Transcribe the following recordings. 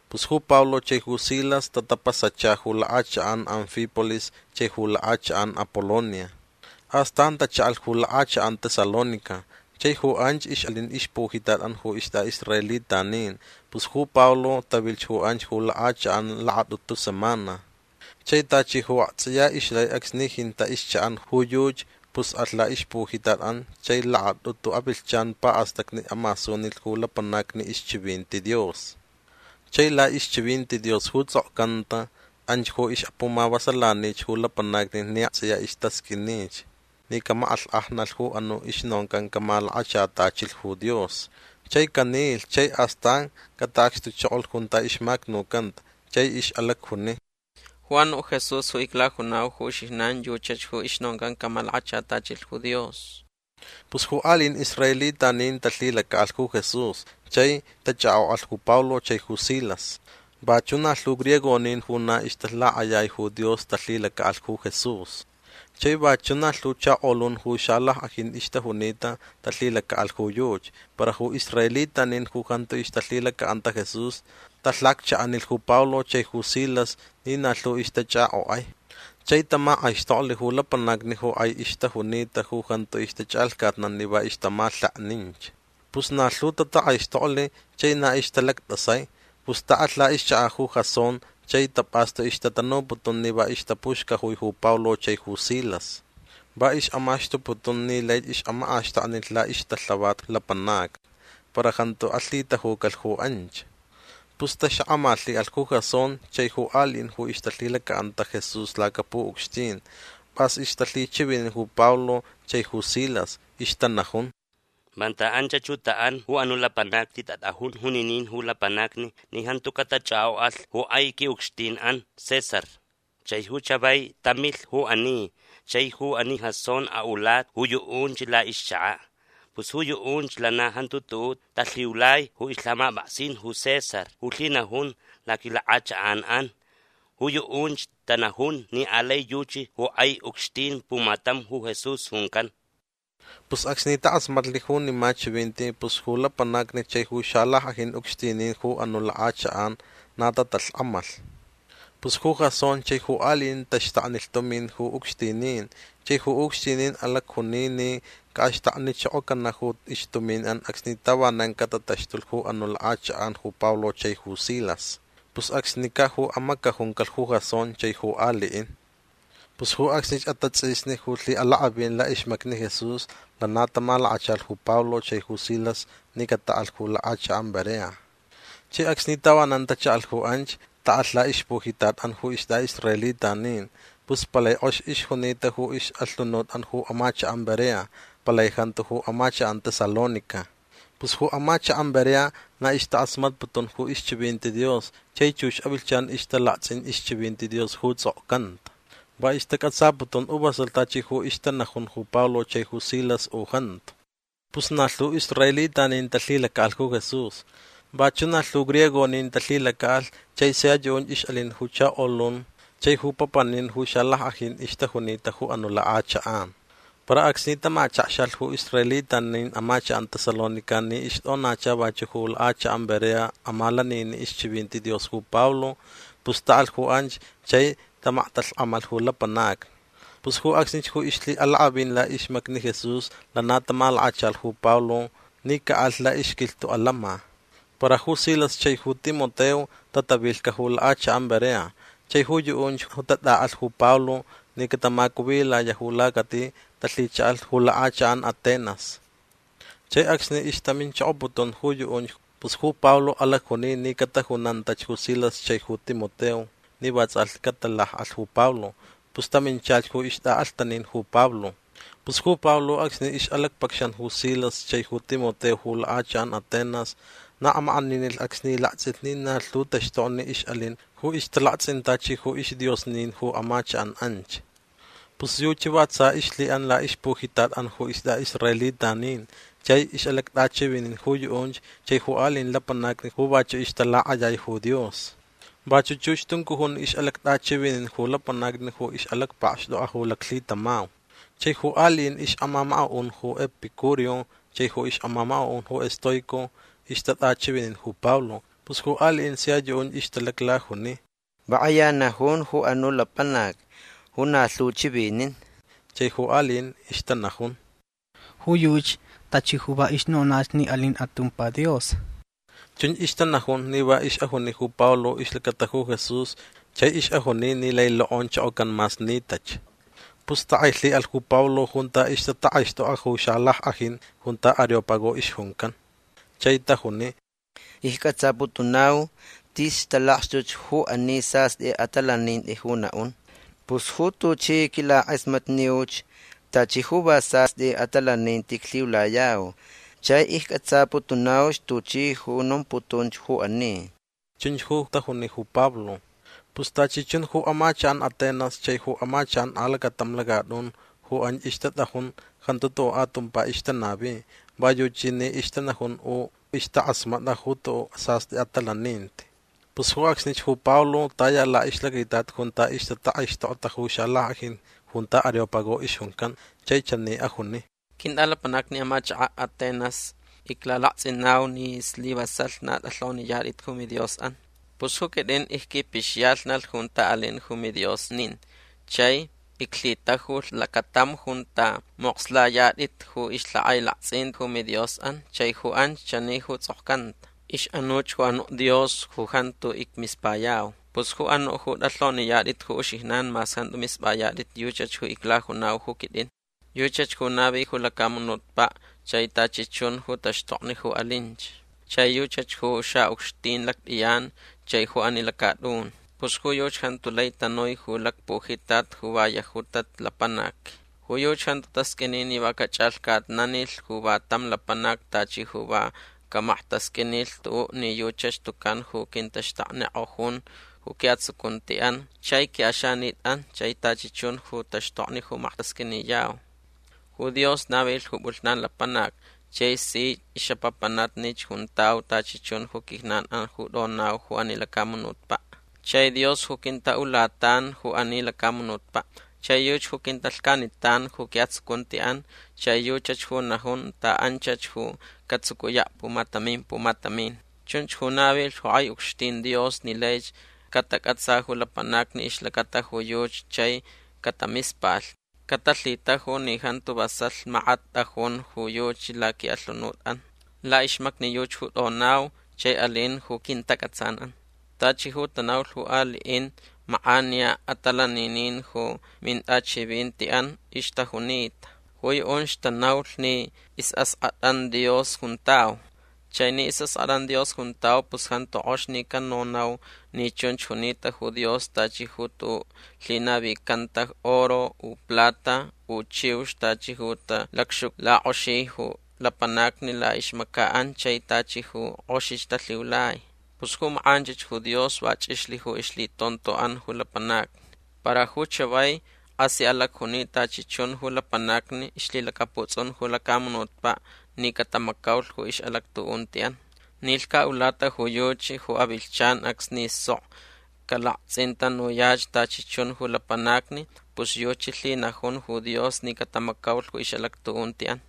Pus ju Pablo chai ju Silas tatapasacha ju lakʼachakʼan Anfípolis chai ju lakʼachakʼan Apolonia. Astan tachaʼalh ju lakʼachakʼan Tesalónica. Chai ju anch ixʼalin ixpujitatʼan ju istʼaʼisraelitanin. Pus ju Pablo tavilh ju anch ju lakʼachakʼan lakatʼutu semana. Chai tachi ju aktsʼiya ixlai acsni jintaʼ ixchaʼan ju yuchi pus alh laʼixpujitatʼan chai lakatʼutu avilhchan paʼastacni amasunilh ju lapanacni ixchivinti Dios. Chai laʼixchivinti Dios ju tsʼokcanta anch ju ixʼapumavasalanich ju lapanacni ni aktsʼiya istasqʼuinich ni camakʼalhkʼajnalh ju anuʼ ju ixnoncan camalakachatachilh Dios. Chai canilh chai astan cataʼacxtuchokolh junta ixmacnucanta. Chai ixʼalacjuni: ―Ju anuʼ Jesús ju iclajunau ju uxijnan yuchach ju ixnoncan camalakachatachilh ju Dios. Pus ju aliʼin israelitanin talhilacaʼalh ju Jesús chai tachʼakʼokʼalh ju Pablo chai ju Silas. Vachuʼ na lhu griegonin ju na ixtalakʼayai ju Dios talhilacaʼalh ju Jesús. Chai vachuʼ na lhu chakolun ju xalackʼajin ixtajunita talhilacaʼalh ju yuchi. Para ju israelitanin ju jantu ixtalhilacaʼanta Jesús talhacchaʼanilh ju Pablo chai ju Silas ni na lhu ixtachʼakʼokʼai. Chai tamakʼaixtoklh ju lapanacni ju kʼai ixtajunita ju jantu ixtachʼalhcatnan ni va ixtamalhekninch. Pus na lhu tatakʼaixtoklh chai na ixtalactʼasai. Pus taʼalh laʼixchakaʼ ju Jasón chai tapʼastu ixtatanuputun ni va ixtapuxcajui ju Pablo chai ju Silas. Va ixʼamaxtuputun ni laich ixʼamakʼaxtaknilh laʼixtalhavat lapanacni. Para jantu alhitajucalh ju anch. Pus taxakʼamalhiʼalh ju Jasón chai ju aliʼin ju ixtalhilacaʼanta Jesús lacapuʼucxtin. Pʼas ixtalhichivinin ju Pablo chai ju Silas. Ixtanajun: ―Vanta anchach ju taʼan ju anuʼ lapanacni tatʼajun juninin ju lapanacni ni jantu catachʼakʼokʼalh ju kʼai quiʼucxtinʼan César. Chai ju chavai tamilh ju ani. Chai ju ani Jasón aʼulata ju yuʼunch laʼixchakaʼ. Pus ju yuʼunch lana jantu tuʼuʼ talhiulai ju ixlhamapʼaksin ju César ju lhinajun laquilakʼachakʼanʼan. Ju yuʼunch tanajun ni alai yuchi ju kʼai ucxtin pumatam ju Jesús juncan. Pus acsni takʼasmatlh junima chivinti pus ju lapanacni chai ju xalackʼajin ucxtinin ju anuʼ lakʼachakʼan na tatalhkʼamalh. Pus ju Jasón chai ju aliʼin taxtaknilh tumin ju ucxtinin. Chai ju ucxtinin alacjuni ni caʼaxtaknichokocanaʼ ju ixtuminʼan acsni tavanan catataxtulh ju anuʼ lakʼachakʼan ju Pablo chai ju Silas. Pus acsnicaʼ ju amacajuncalh ju Jasón chai ju aliʼin. Pus ju acsnich atatsʼisni ju lhiʼalakʼavin laʼixmacni Jesús lana tamalakachalh ju Pablo chai ju Silas ni cataʼalh ju lakʼachakʼan Berea. Chai acsni tavanan tachaʼalh ju anch taʼalh laʼixlacpujitatʼan ju istʼaʼisraelitanin. Pus palai kʼox ixjunita ju ixʼalhunutʼan ju amachakʼan Berea. Palai jantu ju amachakʼan Tesalónica. Pus ju amachakʼan Berea na ixtakʼasmatputun ju ixchivinti Dios chai chux avilhchan ixtalaktsʼin ixchivinti Dios ju tsʼokcanta. Va istacʼatsaputun u vasalh tachi ju ixtanajun ju Pablo chai ju Silas u jantu. Pus na lhu israelitanin talhilacaʼalh ju Jesús. Vachuʼ na lhu ju griegonin talhilacaʼalh chai sia yuʼunch ixʼalin ju chakolun chai ju papanin ju xalackʼajin ixtajunita ju anuʼ lakʼachakʼan. Para acsni tamachakxalh ju israelitanin amachakʼan Tesalónica ni ixtʼonacha vachuʼ ju lakʼachakʼan Berea amalaniniʼ ixchivinti Dios ju Pablo pus taʼalh ju anch chai tamaktalhkʼamalh ju lapanacni. Pus ju acsnich ju ixlhiʼalakʼavin laʼixmacni Jesús lana tamalakachalh ju Pablo ni caʼalh laʼixquilhtuʼ alama. Para ju Silas chai ju Timoteo tatavilhcaʼ ju lakʼachakʼan Berea. Chai ju yuʼunch ju tatʼaʼalh ju Pablo ni catamacuvilayaʼ ju lacati talhichaʼalh ju lakʼachakʼan Atenas. Chai acsni ixtaminchokoputun ju yuʼunch pus ju Pablo alacjuni ni catajunantach ju Silas chai ju Timoteo ni vatsʼalhti catalakʼalh ju Pablo. Pus taminchalh ju ixtʼaʼalhtanin ju Pablo. Pus ju Pablo acsni ixʼalacpacxan ju Silas chai ju Timoteo ju lakʼachakʼan Atenas na amakʼaninilh acsni laktsʼilh ni na lhu taxtokni ixʼalin ju ixtalaktsʼin tachi ju isdiosnin ju amachakʼan anch. Pus yuchi va tsa ixlhiʼan laʼixpujitatʼan ju istʼaʼisraelitanin chai ixʼalactʼachivinin ju yuʼunch chai ju aliʼin lapanacni ju vachuʼ ixtalakʼayai ju Dios. Vachuʼ chux tuncujun ixʼalactʼachivinin ju lapanacni ju ixʼalacpakxtʼokʼa ju laclhitamau. Chai ju aliʼin ixʼamamakaʼun ju Epicúreo chai ju ixʼamamakaʼun ju Estoico ixtatʼachivinin ju Pablo. Pus ju aliʼin sia yuʼunch ixtalaclajuni: ―Va kʼaya najun ju anuʼ lapanac ju na lhu chivinin. Chai ju aliʼin ixtanajun: ―Ju yuchi tachi ju va ixnonach ni alin atumpa dios. Chunch ixtanajun ni va ixʼajuni ju Pablo ixlacata ju Jesús chai ixʼajuni ni lai lokʼonchokocan mas nitach. Pus takʼailhiʼalh ju Pablo junta ixtatakʼaixtʼokʼa ju xalackʼajin junta Areópago ixjuncan. Chai tajuni: ―Iccʼatsaputunau tis talakxtuch ju ani sastʼi atalaninti ju naʼun. Pus ju tuchi quilamakʼasmatniuch tachi ju va sastʼi atalaninti iclhiulayau. Chai iccʼatsaputunau tuchi ju nomputunch ju ani. ―Chunch ju tajuni ju Pablo. Pus tachi chun ju amachakʼan Atenas chai ju amachakʼan alacatam lacatʼun ju anch ixtatʼajun jantu tuʼuʼ atumpa ixtanavi. Va yuchi ni ixtanajun u ixtakʼasmatʼa ju tuʼuʼ sastʼi atalaninti. Pus ju acsnich ju Pablo taya laʼixlacaitat junta ixtatakʼaixtokta ju xalackʼajin junta Areópago ixjuncan chai chani ajuni: ―Quintʼalapanacni amachakʼan Atenas iclalaktsʼinau ni slivasalh na tʼalhoniyatʼit ju midiosʼan. Pus ju quitʼin icquipixiyalhnalh junta alin ju midiosnin chai iclhitajulh lacatam junta mokslayatʼit ju ixlhakʼailaktsʼin ju midiosʼan chai ju anch chani ju tsʼokcanta: “Ixʼanuch ju anuʼ dios ju jantu icmispayau”. Pus ju anuʼ ju tʼalhoniyatʼit ju uxijnan mas jantu mispʼayatʼit yuchach ju iclajunau ju quitʼin. Yuchach ju navilh ju lacamunutpaʼ chai tachi chun ju taxtokni ju alinch. Chai yuchach ju xaʼucxtin lactʼiyan chai ju ani lacatʼun. Pus ju yuchi jantu lai tanui ju lacpujitat ju va yajutach lapanac. Ju yuchi jantu tasqʼuini ni va cachʼalhcatnanilh ju va tam lapanac tachi ju va camaktasqʼuinilh tuʼuʼ ni yuchach tucan ju quintaxtaknikʼojun ju quiʼatsucuntiʼan chai quiʼaxanitʼan chai tachi chun ju taxtokni ju maktasqʼuiniyau. Ju Dios navilh ju pʼulhnan lapanac chai si ixʼapapanatnich juntau tachi chun ju quijnanʼan ju tʼonau ju ani lacamunutpaʼ. Chai Dios ju quintaʼulatan ju ani lacamunutpaʼ. Chai yuchi ju quintalhcanitan ju quiʼatsucuntiʼan chai yuchach ju najun taʼanchach ju catsucuyaʼ pumatamin pumatamin. Chunch ju navilh ju kʼai ucxtin Dios ni laich catacʼatsa ju lapanacni ixlacata ju yuchi chai catamispalh. Catalhitaju ni jantu vasalh makat tʼajun ju yuchi laquiʼalhunutʼan. Laʼixmacni yuchi ju tʼonau chai alin ju quintacʼatsanʼan. Tachi ju tanaulh ju aliʼin makʼaniya atalaninin ju mintʼachivintiʼan ixtajunita. Ju yuʼunch tanaulh ni isʼaskʼatʼan Dios juntau. Chai ni isʼaskʼatʼan Dios juntau pus jantu kʼox ni canonau ni chunch junita ju Dios tachi ju tuʼuʼ lhinavicanta oro u plata u chiux tachi ju talacxuclakʼoxi ju lapanacni laʼixmacaʼan chai tachi ju kʼoxich talhiulai. Pus ju makʼanchich ju Dios va chʼixlh ju ixlhitontoʼan ju lapanacni. Para ju chavai kʼasi alacjuni tachi chun ju lapanacni ixlhilacaputsʼun ju lacamunutpaʼ ni catamacaulh ju ixʼalactuʼuntiʼan. Ni lhcaʼulata ju yuchi ju avilhchan acsni sok calaktsʼintanuyach tachi chun ju lapanacni pus yuchi lhinajun ju Dios ni catamacaulh ju ixʼalactuʼuntiʼan.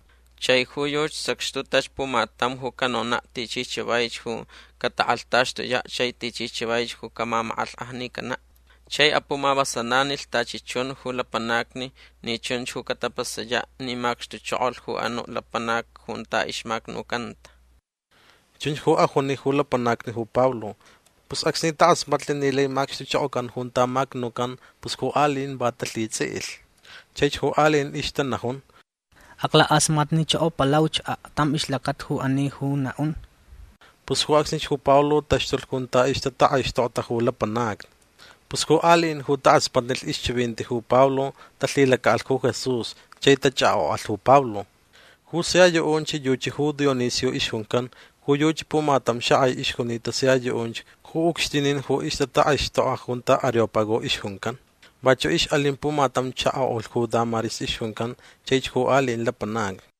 Chai ju yuchi sacxtutach pumatam ju canonaʼ tichi chavaich ju catakʼalhtaxtuyaʼ chai tichi chavaich ju camamakʼalhkʼajnicanaʼ. Chai apumavasalanilh tachi chun ju lapanacni ni chunch ju catapasayaʼ ni macxtuchokolh ju anuʼ lapanac junta ixmacnucanta. ―Chunch ju ajuni ju lapanacni ju Pablo. Pus acsni takʼasmatlh ni lai macxtuchokocan junta macnucan pus ju aliʼin va talhitsʼiʼilh. Chaich ju aliʼin ixtanajun: ―Aclakʼasmatnichokopalauch aktam ixlacata ju ani ju naʼun. Pus ju acsnich ju Pablo taxtulh junta ixtatakʼaixtokta ju lapanacni. Pus ju aliʼin ju takʼasmatnilh ixchivinti ju Pablo talhilacaʼalh ju Jesús chai tachʼakʼokʼalh ju Pablo. Ju sia yuʼunch yuchi ju Dionisio ixjuncan. Ju yuchi pumatam xakʼai ixjunita sia yuʼunch ju ucxtinin ju ixtatakʼaixtʼokʼa junta Areópago ixjuncan. Vachuʼ ixʼalin pumatam chakoʼulh ju Dámaris ixjuncan chaich ju aliʼin lapanacni.